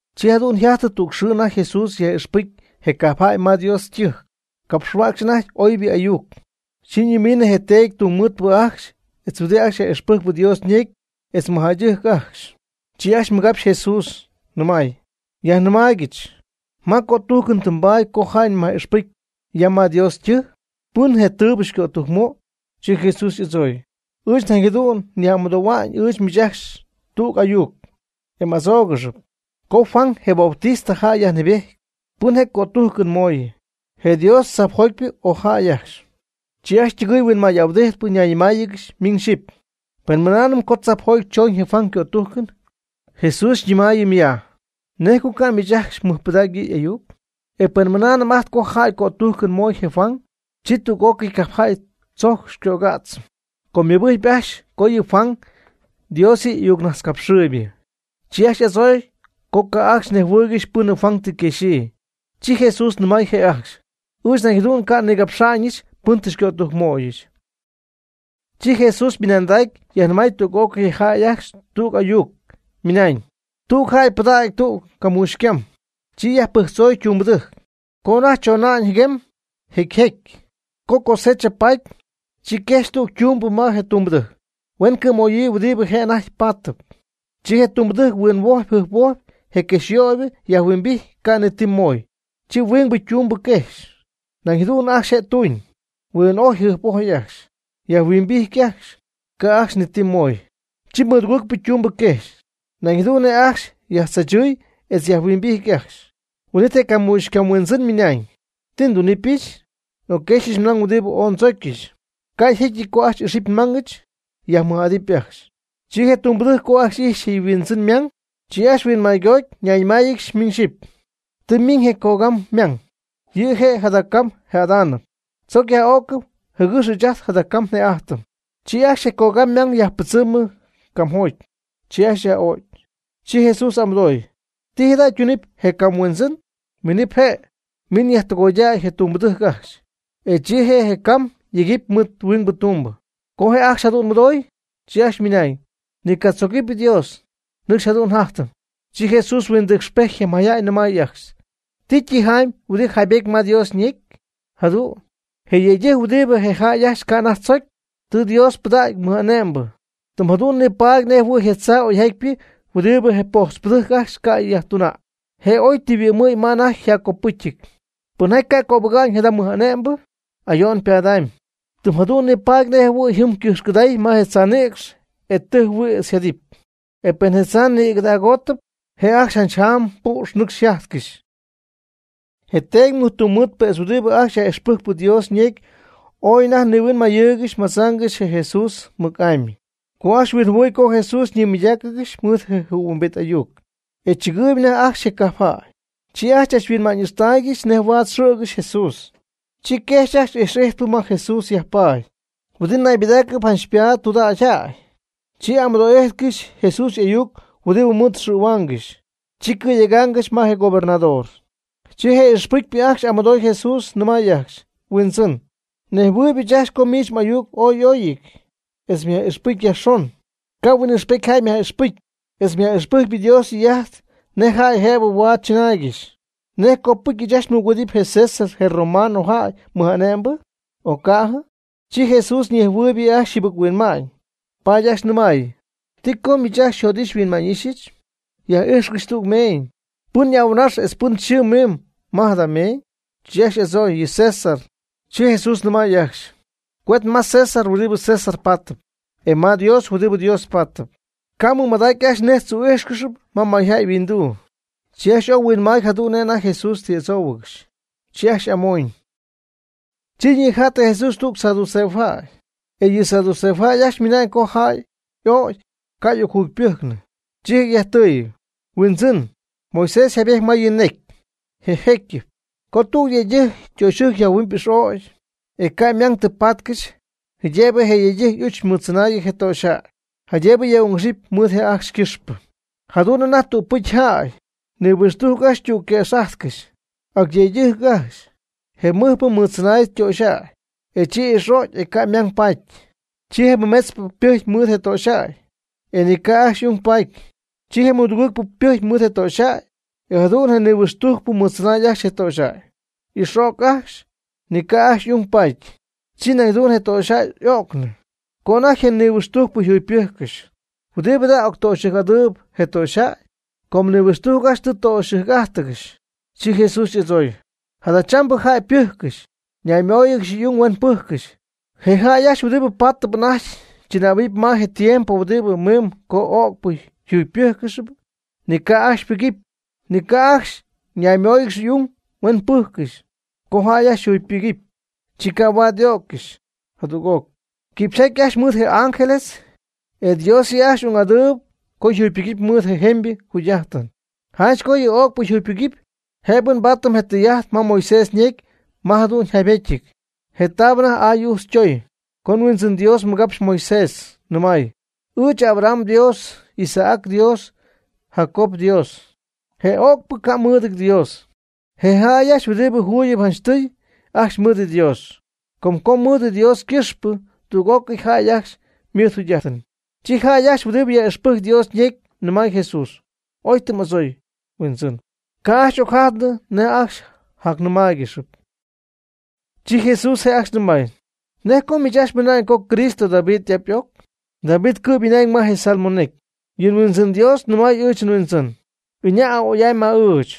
Chi jadu'n yjajty tüg xɨɨ anajty Jesús yaj'ixpɨcy je cajpjäy ma Dios ytɨjc, capxhuäcxy anajty oybɨ ayuc. Chi ñimiinɨ je teedy tungmɨɨdpɨ ajcxy etz huɨdi ajcxy yaj'ixpɨjc Dios ñecy etz mɨjjäydɨjc ajcxy. Chi ajcxy mɨgapxy Jesús nɨmay: ―Yajnɨmaaygɨch, ¿ma cötújcɨn tɨ mbaady co jäy myaj'ixpɨcy ya ma Dios ytɨjc? ¿Pɨn je' tɨɨbɨ xycötujc möy? Chi Jesús y'adzooy: ―Ɨɨch nañ jadu'n nyaj'amɨdohuamy ɨɨch miich ajcxy tüg ayuc, e m'adzóogɨxɨp. Co Juan (je Bautista) jäy yajnɨɨbejty, ¿pɨn je' cötújcɨn moy, je Dios tzajpjotypɨ o jäy ajcxy? Chi ajcxy ytɨgɨɨy huinmay'ahuɨdijtpɨ ñayñɨmáayɨgɨxy miñ xyɨpy: ―Pen mɨnaanɨm co tzajpjoty choñ je Juan ycötújcɨn, Jesús xyñɨmaayɨmɨp ya: “¿Nej co ca' miich ajcxy mɨjpɨdacy yɨ' y'ayuc?” Pen mɨnaanɨm ajt co jäy cötújcɨn moy je Juan, chi tüg'ócɨy cajpjäy tzojc xycögädzɨm, com ymɨbɨjcpy ajcxy co yɨ Juan, Dios yɨ' y'ayucnajtzcapxɨɨybɨ. Chi ajcxy y'adzooy co ca' ajcxy nejhuɨɨygɨxy pɨn Juan tɨ quexyii. Chi Jesús nɨmay je' ajcxy: ―Ɨɨch nañ jadu'n ca' nigapxa'ñɨch pɨn tɨ xycötujcmöyɨch. Chi Jesús ymɨnandacy yajnɨmay tüg'ócɨy je jäy ajcxy tüg ayuc, ymɨnañ: ―Tüg jäy pɨdacy tüg camuuxy ycam, chi yajpɨjctzoy ytumbɨdɨjc, co anajty chona'ñ ñɨcxa'ñ jɨguem jecy jecy. Co cosecha paty, chi quejxy tüg ytumbɨ ma je ytumbɨdɨjc, huen cɨ̈möyii huɨdibɨ je' anajty paatɨp. Chi je ytumbɨdɨjc huinhuojpy jɨjphuojpy je quejxyöybɨ yajhuimbijty ca' ni ti mooy. Chi huingbɨ ytumbɨ quejxy, nañ jadu'n ajcxy je' tuñ, huin'ojy jɨjp'ojy ajcxy, yajhuimbijty ajcxy, ca' ajcxy ni ti mooy. Chi mɨdugɨɨgpɨ ytumbɨ quejxy, nañ jadu'n ajcxy je' yajtzaachɨɨy etz yajhuimbijty ajcxy. Huin'it je camuuxycam huindzɨn ymɨnañ: “¿Ti ndunɨpyɨch? Ocquejxyɨch nmang huɨdibɨ ooy ndzocyɨch. Ca' jécyɨty co ajcxy ixɨpy nmangɨch, yajmɨj'adɨpy ajcxy.” Chi je ytumbɨdɨjc co ajcxy ijxy je' yhuindzɨn ymang, chi ajcxy huinmaygoty nayñɨmáayɨgɨxy miñ xyɨpy: “Tɨ ymiñ je cogam ymang, yɨ' je' jada cam jëdaanɨp. Tzoc yaj'o'cɨm jɨgɨx ɨɨch ajt jada cam një'ajtɨm.” Chi ajcxy je cogam ymang yajpɨdzɨmɨ camjoty, chi ajcxy yaj'o'cy. Chi Jesús y'amɨdooy: ―¿Ti jada' ytunɨpy je cam huindzɨn? Minɨp je', miñ yajtɨgoydäy je ytumbɨdɨjc ajcxy, e chi je' je ycam yegɨpy mɨɨd huingbɨ tumbɨ. Co je jäy ajcxy jadu'n mɨdoy, chi ajcxy ymɨnañ: ―Ni catzogɨpy Dios, nɨcxy jadu'n njajtɨm. Chi Jesús huindɨcxpejty je mayjäy nɨmay ajcxy: ―¿Ti tijamy huɨdi yjaybétyɨp ma Dios ñecy? Jadu'n: Je yëydɨjc huɨdi je jäy ajcxy ca' anajty tzocy, tɨ Dios pɨdacy mɨj'ane'mbɨ. Tɨm jadu'n nipaady nejɨhuɨ̈y je tzaa oyjatypɨ huɨdibɨ je pojtzpɨdɨjc ajcxy ca' yajtuna'ñ, je' oy tɨ yhuɨ'mnɨ ma anajty yjaccopɨ́cyɨty. Pɨnjaty ca' cöbɨga'ñ jada mɨj'ane'mbɨ, ayo'n ypadamy, tɨm jadu'n nipaady nej jɨhuɨ̈y jɨm ycɨjxcɨday ma je tzaa nïcx e tɨjhuïtz yjajtähuɨpy; e pen je tzaa nïgɨdagoty, je' ajcxy janch jaam püx nɨcxy yjajtcɨxy. Je teedy tungmɨɨdpɨ etz huɨdi ajcxy yaj'ixpɨjc Dios ñecy ooy anajty nihuinmayɨɨygɨxy madzaangɨxy je Jesús mɨc'amy, co ajcxy huinjɨhuɨy co Jesús nimɨydáacɨgɨxy mɨɨd je jɨhuimbit ayuc, e chɨgɨɨyb anajty ajcxy je cajp jäy. Chi ajcxy chachhuinma'ñ'ixtaaygɨxy nej huaad xɨ̈gɨxy Jesús, chi quejxy ajcxy ijx'ijtpɨ ma Jesús yajpaady huɨdi naybɨdaacɨp janch ypaat tudägyjäy; chi amɨdoo'íjtcɨxy Jesús y'ayuc huɨdi mɨɨd xɨ̈huaangɨxy, chi cɨ̈yegaangɨxy ma je gobernador. Chi je ijx'ijtpɨ ajcxy y'amɨdooy Jesús nɨmay ajcxy: ―Huindzɨn, nejhuɨɨyb ɨɨch ajcxy co miich m'ayuc ooy y'óyɨty, etz myaj'ixpɨcy yajxon, ca' huin'ixpety jäy myaj'ixpɨcy, etz myaj'ixpɨcy Dios ytɨy'ajt nej jäy jëbɨ huaad chɨnaaygɨxy. ¿Nej copɨcy ɨɨch ajcxy mɨgüedɨpy je César je romanojäy mɨj'ane'mbɨ, o ca'ɨjɨ? Chi Jesús huinjɨhuɨɨy yɨ' ajcxy yjɨbɨc-huinma'ñ, paady ajcxy nɨmay: ―¿Ti co miich ajcxy xyjot'ixy xyhuinma'ñ'íxyɨch? Yaj'ijxcɨch tüg meeñ. ¿Pɨn y'ahuɨnax etz pɨn yxɨɨ mimb ma jada meeñ? Chi ajcxy y'adzooy: ―Yɨ César. Chi Jesús nɨmay ajcxy: ―Cuet ma César huɨdi César paatɨp, e ma Dios huɨdi Dios paatɨp. Ca' mɨmadacy ajcxy nej tzu'íjxcɨxy ma mayjäy yhuinduu. Chi ajcxy ooy huinmaay jadu'n nej anajty Jesús tɨ y'adzóohuɨgɨxy, chi ajcxy amoñyɨ. Chi ñija'ttɨ Jesús tüg saduceojäy, e yɨ saduceojäy ajcxy ymɨnañ co jäy ögy ca' y'ocjuyujcnɨ. Chi je' yajtɨy: ―Huindzɨn, Moisés jaybety ma yɨ' ñecy, je jécyɨp, co tüg yëydɨjc ytöxyɨjc yajhuɨ'my ix'ögp, e ca' ymang tɨ paatcɨxy. Jëbɨ je yëydɨjc y'uch mɨɨdtzɨnäy je töxyjäy jaydëbɨ yaj'ung'ixɨp mɨɨd y'ajch ycɨxpɨ. Jadu'n anajty tügpɨcy jäy, nihuixtujc ajcxy ytügquëx'ájtcɨxy, ac yëydɨjc ajcxy. Je mɨjpɨ mɨɨdtzɨnay töxyjäy, chi ix'o'cy, e ca' ymang paty. Chi je mɨmetzpɨ ypɨjcy mɨɨd je töxyjäy, e ni ca' ajcxy ung paty. Chi je mɨdugɨɨgpɨ ypɨjcy mɨɨd je töxyjäy, e jadu'n je nihuixtujcpɨ mɨɨdtzɨnay ajcxy je töxyjäy, ix'o'cy ajcxy, ni ca' ajcxy ung paty. Chi nañ jadu'n je töxyjäy y'ögnɨ. Co anajty je nihuixtujcpɨ jugypɨjccɨxy, ¿huɨdi jada' octöxɨjc'adɨɨyb je töxyjäy? Com nihuixtujc ajcxy tɨ töxyɨjc'ájtɨgɨxy. Chi Jesús y'adzooy: ―Jadachambɨ jäy pɨ́jccɨxp, ñaymooyɨgɨxy y'ung huen pɨ́jccɨxy. Je jäy ajcxy huɨdibɨ paatɨp anajty chɨnähuɨp ma je tiempo huɨdi mimb co ögpɨ yjugypɨ́jccɨxɨpy, ni ca' ajcxy ypɨgɨpy, ni ca' ajcxy ñaymóoyɨgɨxɨpy y'ung huen pɨ́jccɨxy. Co jäy ajcxy yjugypɨcy, chi ca' huaad y'ögcɨxy jadüg'oc, quipxyjaty ajcxy mɨɨd je ángeles ajcxy, e Dios yɨ' ajcxy ung'adɨɨb co yjugypɨgɨpy mɨɨd jemybɨ jugy'ájtɨn. Janch co yɨ ögpɨ yjugypɨgɨpy, jëbɨ mbaadɨp je tɨy'ajt ma Moisés ñecy ma jadu'n yjaybétyɨty, je taab anajty aay'ujtz ytoy, co je Huindzɨn Dios mɨgapxy Moisés, nɨmay: “Ɨɨch Abraham yDios, Isaac yDios, Jacob yDios.” Je ögpɨ ca' mɨɨdɨty Dios. Je jäy ajcxy huɨdi juugyɨp janchtɨy ajcxy ymɨɨd Dios, com co mɨɨd Dios ycɨxpɨ tüg'ócɨy jäy ajcxy ymɨɨd yjugy'ajt. Chi jäy ajcxy huɨdi yaj'ixpɨjcp Dios ñecy nɨmay Jesús: ―Oy tɨ m'adzoy, Huindzɨn. Ca' ajcxy ocjajtnɨ nej jac nɨmáaygɨxɨpy. Chi Jesús je' ajcxy nɨmay: ―¿Nej co miich ajcxy mɨna'ñ co Cristo David y'ap y'oc? David cɨ'm mɨna'ñ ma je Salmo necy: Yɨ Huindzɨn Dios nɨmay ɨɨch nHuindzɨn: “Iña' ya a'oy'amy ma ɨɨch.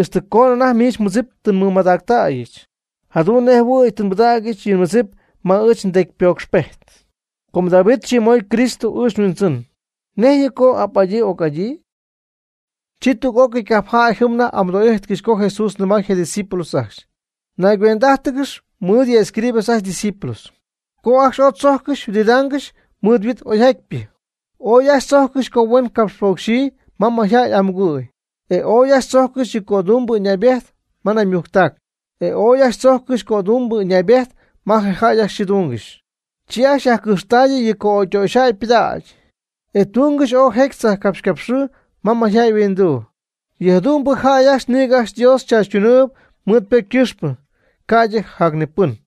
Ixtɨ coonɨ anajty miich mmɨdzip tɨ nmɨmadactäyɨch, jadu'n nej jɨhuɨ̈y tɨ nbɨdägyɨch yɨ mmɨdzip ma miich mdecypocxpejt.” Co David yxɨɨmoy Cristo ɨɨch nHuindzɨn, ¿nejtz yɨ' co y'ap'adyii y'oc'adyii? Chi tüg'ócɨy cajpjäy jɨm anajty y'amɨdo'ijtcɨxy co Jesús nɨmay je' ydiscípulos ajcxy: ―Naygüend'ájtɨgɨx mɨɨd yɨ' escribas ajcxy ydiscípulos, co ajcxy ooy tzojccɨxy yhuɨdidaangɨxy mɨɨd yhuit oyjatypɨ, ooy ajcxy tzojccɨxy co huen capxpocxyii ma jäy y'amugɨ̈y, e ooy ajcxy tzojccɨxy yɨ cödumbɨ ɨñaybejt ma naymujctac, etz ooy ajcxy tzojccɨxy cödumbɨ ɨñaybejt ma jäy ajcxy yxɨɨdungɨxy. Chi ajcxy yajcɨjxtayɨ yɨ co'ögytöxyjäy ypɨdägy, e tungɨxy ooy jecy tzajpcapxycapxɨɨ ma jäy yhuinduu. Yɨ jadu'mbɨ jäy ajcxy nïgɨ ajcxy Dios chaachytunɨɨyb mɨɨd ypocy ycɨxpɨ ca'ydɨ jacnipɨn.